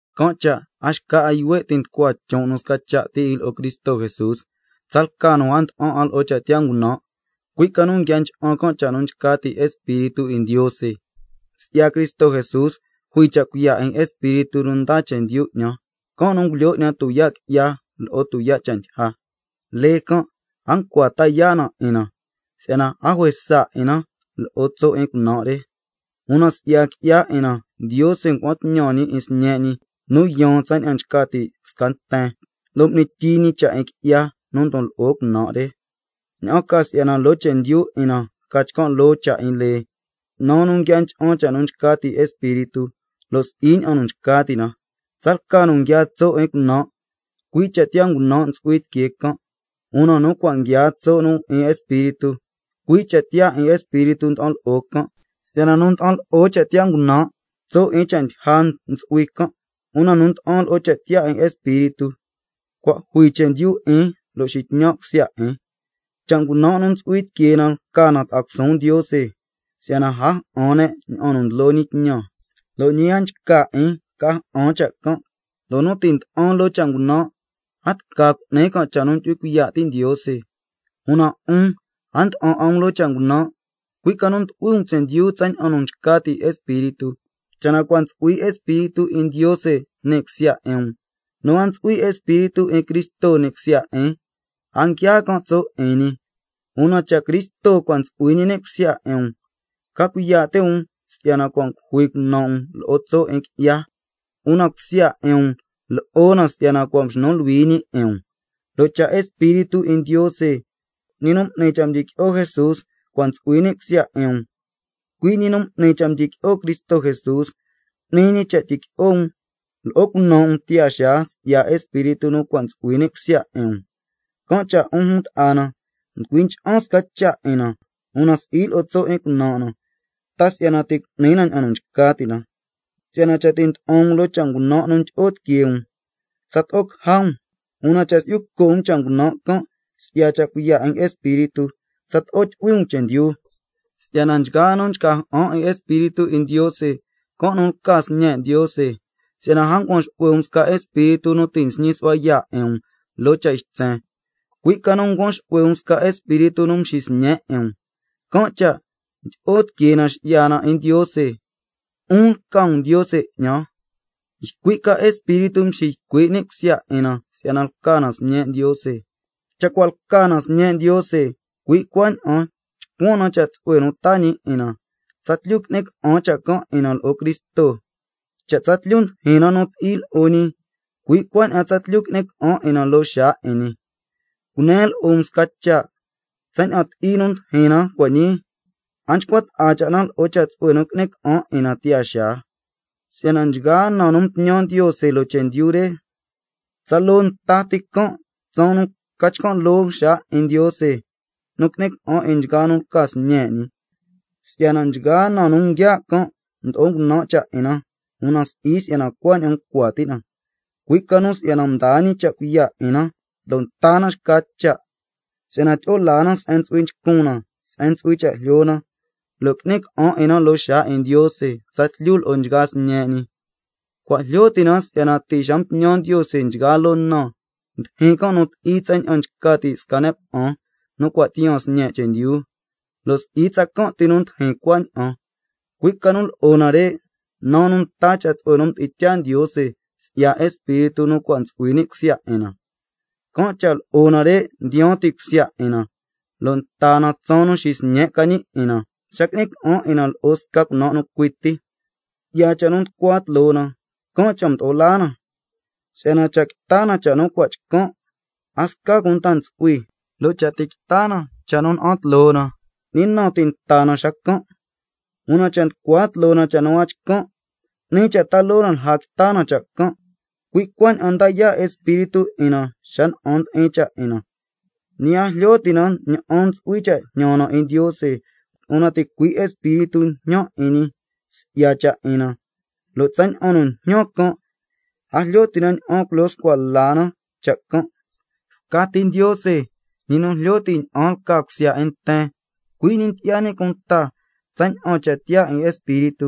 Can' cha' a xca 'a yuhue' ti' nducua chon' nu sca cha' ti 'in lo'o Cristo Jesús, tsalca nu a nda'an 'a lo'o cha' tiyaa ngunan', cui' ca nu nguia ncha'an cha' nu nchca ti' Espíritu 'in Ndiose. Si'ya Cristo Jesús jui cha' cuiya' 'in Espíritu nu ndaa chendyu 'ñan, can' nu ngulyoo 'ñan tuyaa' qui'ya lo'o tuyaa' cha' ndyija. Lee can' a ncua ta yaa' na 'in na si'yana a juesa 'in na lo'o tso' 'in cunan' re, una si'ya qui'ya 'in na Ndiose ngua'an tñan ñi 'in Sñe' ñi nu yaan tsaña'an nchca ti' sca nten, lo' m'ni tyii ñi cha' 'in qui'ya nu ndon lo'o cunan' re, ña'an ca si'yana loo chendyu 'in na ca chcan' loo cha' 'in lee, naa nu nguia ncha'an cha' nu nchca ti' Espíritu, lo' si'i ña'an nu nchca ti' na. Tsalca nu nguiaa tso' 'in cunan', cui' cha' tiyaa ngunan' ntsu'hui tiquee can', una nu cua' nguiaa tso' nu 'in Espíritu, cui' cha' tiyaa 'in Espíritu nda'an lo'o can'. Si'yana nu nda'an lo'o cha' tiyaa ngunan', tso' 'in cha' ndyija ntsu'hui can', una nu nda'an lo'o cha' tiyaa 'in Espíritu, cua' jui chendyu 'in lo' nxitñan' cusya 'in. Si'yana cha' ngunan' nu ntsu'hui tiquee na lca na ta'a cusuun Ndiose, si'yana a ja'an can' ña'an nu ndlo ñi tñan, lo' ñi a nchca 'in ca ja'an cha' can', lo' nu ti' nda'an loo cha' ngunan', a tca cu'ni can' cha' nu ndyu'hui cuiya' ti' Ndiose. Una 'un a nda'an 'a um loo cha' ngunan', cui' ca nu ndu'hui um chendyu tsaña'an nu nchca ti' Espíritu, cha' na cua' ntsu'hui Espíritu 'in Ndiose ni' cusya 'in um. Nu a ntsu'hui Espíritu 'in Cristo ni' cusya 'in, a nguiaa can' tso' 'in ñi. Una cha' Cristo cua' ntsu'hui ñi ni' cusya 'in um, ca cuiya' ti' um si'yana cua' ngujui cunan' um lo'o tso' 'in qui'ya, una cusya 'in um lo'o na si'yana cua' mxnu luhui ñi 'in um. Lo' cha' Espíritu 'in Ndiose, ñi nu m'ni cha' mdyiqui'o Jesús cua' ntsu'hui ni' cusya 'in um, cui' ñi nu m'ni cha' mdyiqui'o Cristo Jesús, cu'ni ñi cha' tyiqui'o um lo'o cunan' um tiyaa xaa si'ya Espíritu nu cua' ntsu'hui ni' cusya 'in um. Can' cha' 'un jun ta'a na, nducui ncha'an sca cha' 'in na, una si'i lo'o tso' 'in cunan' na, ta si'yana ti' cu'ni na ña'an nu nchca ti' na, si'yana cha' ti' nda'an um loo cha' ngunan' nu ndyi'o tiquee um, tsato'o caja um xacan', una cha' si'yu co' um cha' ngunan' can' si'ya cha' cuiya' 'in Espíritu, tsato'o tyu'hui um chendyu. Si'yana nchgaa nu nchca ja'an 'in Espíritu 'in Ndiose, can' nu lca sñe' Ndiose. Si'yana a ncuan xu'hue um sca espíritu nu ti' xñi su'hua yaa' 'in um loo cha' ytsen, cui' ca nu ncuan xu'hue um sca espíritu nu mxisñe' 'in um, can' cha' ndyi'o tiquee na nxi'ya na 'in Ndiose: ¡Abba, 'un lca um Ndiose 'ñan! Ycui' ca Espíritu nxiycui' 'in cusya 'in na si'yana lca na sñe' Ndiose. Cha' cua' lca na sñe' Ndiose, cui' cuaña'an chcuan na cha' tsu'hue nu taa ñi 'in na, tsatlyu qui'ni ca'an cha' can' 'in na lo'o Cristo. Cha' tsatlyu ndijin na nu ti'i lo'o ñi, cui' cuaña'an tsatlyu qui'ni ca'an 'in na loo xaa 'in ñi. Cunen lo'o um sca cha', tsaña'an ti'i nu ndijin na cua' ñii, a nchcua ta'a na lo'o cha' tsu'hue nu qui'ni ca'an 'in na tiyaa xaa. Si'yana nchgaa na nu mtñan Ndiose loo chendyu re, tsaloo nta ti can' tsaan nu ca chcan' loo xaa 'in Ndiose nu qui'ni ca'an 'in nchgaa nu lca sñe' ñi. Si'yana nchgaa na nu nguia' can' mdo'o ngunan' cha' 'in na, una si'i si'yana cuaña'an ncua ti' na, cui' ca nu si'yana mdaa ñi cha' cuiya' 'in na lo' nta na xca cha', si'yana tyi'o laa na se'en ntsu'hui nchcun na se'en ntsu'hui cha' jlyo na, lo' qui'ni ca'an 'in na loo xaa 'in Ndiose tsatlyu lo'o nchgaa sñe' ñi. Cua' jlyo ti' na si'yana ti' xa mtñan Ndiose nchgaa loo na, ndijin na nu ti'i tsaña'an nchca ti' sca ne' cuna'an nu cua' tiyaan sñe' chendyu, lo' si'i tsacan' ti nu ndijin cuaña'an, cui' ca nu lo'o nare', naa nu nta cha' tsu'hue nu mdi'in tyaa Ndiose si'ya Espíritu nu cua' ntsu'hui ni' cusya 'in na, can' cha' lo'o nare' ndiyaan ti' cusya 'in na lo' nta na tsaan nu xisñe' ca ñi 'in na, xa qui'ni ca'an 'in na lo'o sca cunan' nu cui ti. Si'ya cha' nu nducua tloo na, can' cha' mdo'o laa na, si'yana cha' quita na cha' nu cua' chcan', a sca cunta ntsu'hui, lo' cha' ti' quita na cha' nu na'an tloo na, ¿ñi na ti' nta na xacan'? Una cha' nducua tloo na cha' nu a chcan', 'ni cha' ta loo na lja quita na cha' can'. Cui' cuaña'an nda yaa' Espíritu 'in na si'yana na'an ndi'in cha' 'in na, ñi a jlyo ti' na ña'an ntsu'hui cha' jñan na 'in Ndiose, una ticui' Espíritu njñan 'in ñi si'ya cha' 'in na, lo' tsaña'an nu njñan can' a jlyo ti' na ña'an culyo scua na cha' can'. Scati Ndiose, ñi nu jlyo ti' ña'an lca cusya 'in nten, cui' ñi ndyi'ya ñi cunta tsaña'an cha' tiyaa 'in Espíritu,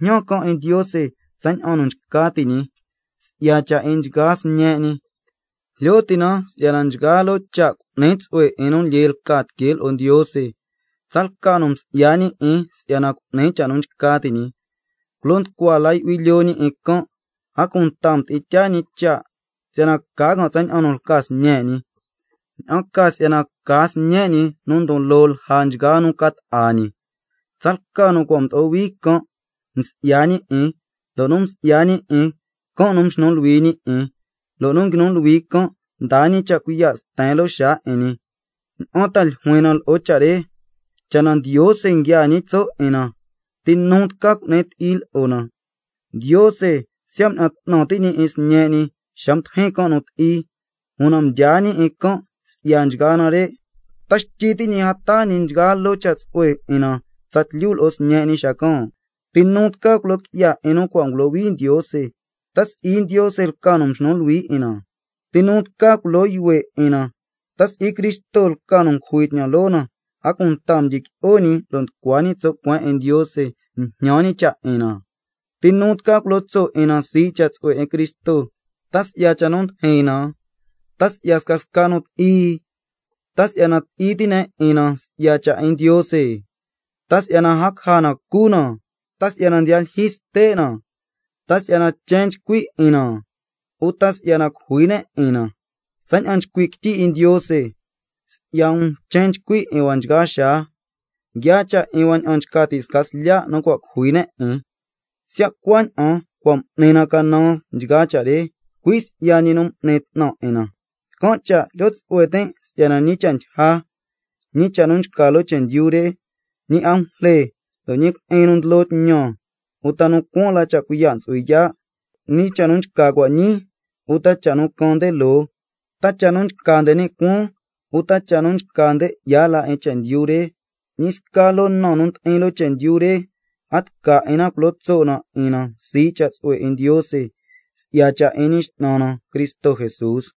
njñan can' 'in Ndiose tsaña'an nu nchca ti' ñi si'ya cha' 'in nchgaa sñe' ñi. Jlyo ti' na si'yana nchgaa loo cha' cu'ni tsu'hue 'in nu lyee lca tiquee lo'o Ndiose, tsalca nu msi'ya ñi 'in si'yana cu'ni cha' nu nchca ti' ñi. Culo nducua la yu'hui lyoo ñi 'in can', a cunta mdi'in tyaa ñi cha' si'yana ca can' tsaña'an nu lca Sñe' ñi, ña'an ca si'yana ca Sñe' ñi sca nu ndon loo lja nchgaa nu ca ta'a ñi. Tsalca nu cua' mdo'o hui can', msi'ya ñi 'in, lo' nu msi'ya ñi 'in, can' nu mxnu luhui ñi 'in, lo' nu nguinu luhui can', mdaa ñi cha' cuiya' sten loo xaa 'in ñi. ¿Ña'an ta ljuin na lo'o cha' re, cha' na Ndiose nguiaa ñi tso' 'in na, ti nu tca cu'ni ti'i lo'o na? Ndiose siya' mña'an 'tnan ti' ñi 'in Sñe' ñi xa mdijin can' nu ti'i, una mdyaa ñi 'in can' si'ya nchgaa nare', ¿ta xtyi ti' ñi a taa ñi nchgaa loo cha' tsu'hue 'in na tsatlyu lo'o Sñe' ñi xacan'? ¿Ti nu tca culo qui'ya 'in nu cua' ngulohui Ndiose? ¿Ta si'i Ndiose lca nu mxnu luhui 'in na? ¿Ti nu tca culo yuhue' 'in na? ¿Ta si'i Cristo lca nu ngujui tñan loo na, a cunta mdyiqui'o ñi lo' nducua ñi tso' cueen 'in Ndiose, njñan ñi cha' 'in na? ¿Ti nu tca culo tso' 'in na sii' cha' tsu'hue 'in Cristo? ¿Ta si'ya cha' nu ndijin na, ta si'ya scasca nu ti'i, ta si'yana ti'i ti' ne' 'in na si'ya cha' 'in Ndiose, ta si'yana a caja na nu cu na, ta si'ya ndiya lyijyi ste' na, ta si'yana chen nchcui 'in na, uta si'yana cujui ne' 'in na? Cui' ña'an nchcui' quityi 'in Ndiose: —Si'ya um chen nchcui 'in hua nchgaa xaa, Nguiaa cha' 'in hua ña'an nchca ti' sca slya' nu cua' cujui ne' 'in—. Siya' cuaña'an, cua' m'ni na canan nchgaa cha' re, cui' si'ya ñi nu m'ni 'tnan 'in na. Can' cha' jlyo tsu'hue tin' si'yana ñi cha' ndyija, ñi cha' nu nchca loo chendyu re, ñi angujle, lo' ñi cui'in nu ndlo tñan, uta nu cuaan la cha' cuiya' ntsu'hui yaa', ñi cha' nu nchca cua' ñii uta cha' nu caan nde loo, ta cha' nu nchca nde ni' cuaan uta cha' nu nchca nde 'ya la 'in chendyu re, ñi sca loo na nu ndi'in loo chendyu re, a tca 'in na culo tso' na 'in na sii' cha' tsu'hue 'in Ndiose, si'ya cha' 'in Ñi X'nan na Cristo Jesús.